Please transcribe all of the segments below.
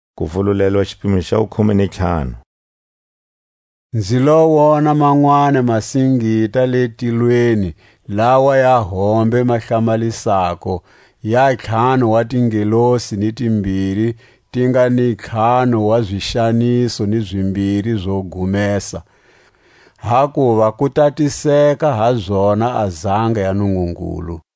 A makhombo yo gumesa. Nzi lo wona manwani masingita le tilweni lawa ya hombe ma hlamalisako, ya ntlhanu wa tingelosi ni timbiri ti nga ni ntlhanu wa zixaniso ni zimbiri zo gumesa, hakuva ku tatiseka ha zona a zanga ya Nungungulu.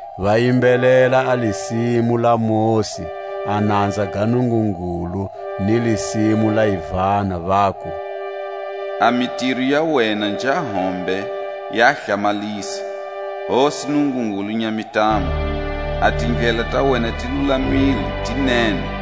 Va yimbelela a lisimu la Mosi, a nanza ga Nungungulu, ni lisimu la Yivana, vaku: A mitiro ya wena nja hombe ya hlamalisa, Hosi Nungungulu Nyamintamu, A tindlela ta wena ti lulamile ti nene,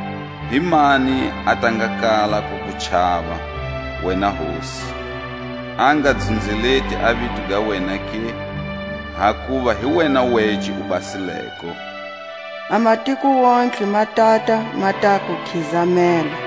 Himani a ta nga kala ku ku chava, wena Hosi, A nga dzunzeleti a vito ga wena ke? Hakuva hi wena wece u basileko, A matiko wontihe ma tata ma ta ku khizamela: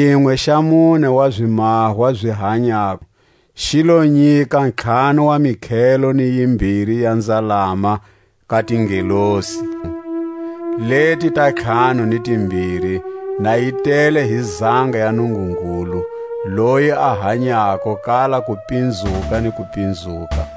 Xinwe xa mune wa zimahwa zi hanyako xi lo nyika ntlhanu wa mikhelo ni yimbiri ya nzalama ka tingelosi leti ta ntlhanu ni timbiri, na yi tele hi zanga ya Nungungulu, loyi a hanyako kala kupinzuka ni kupinzuka.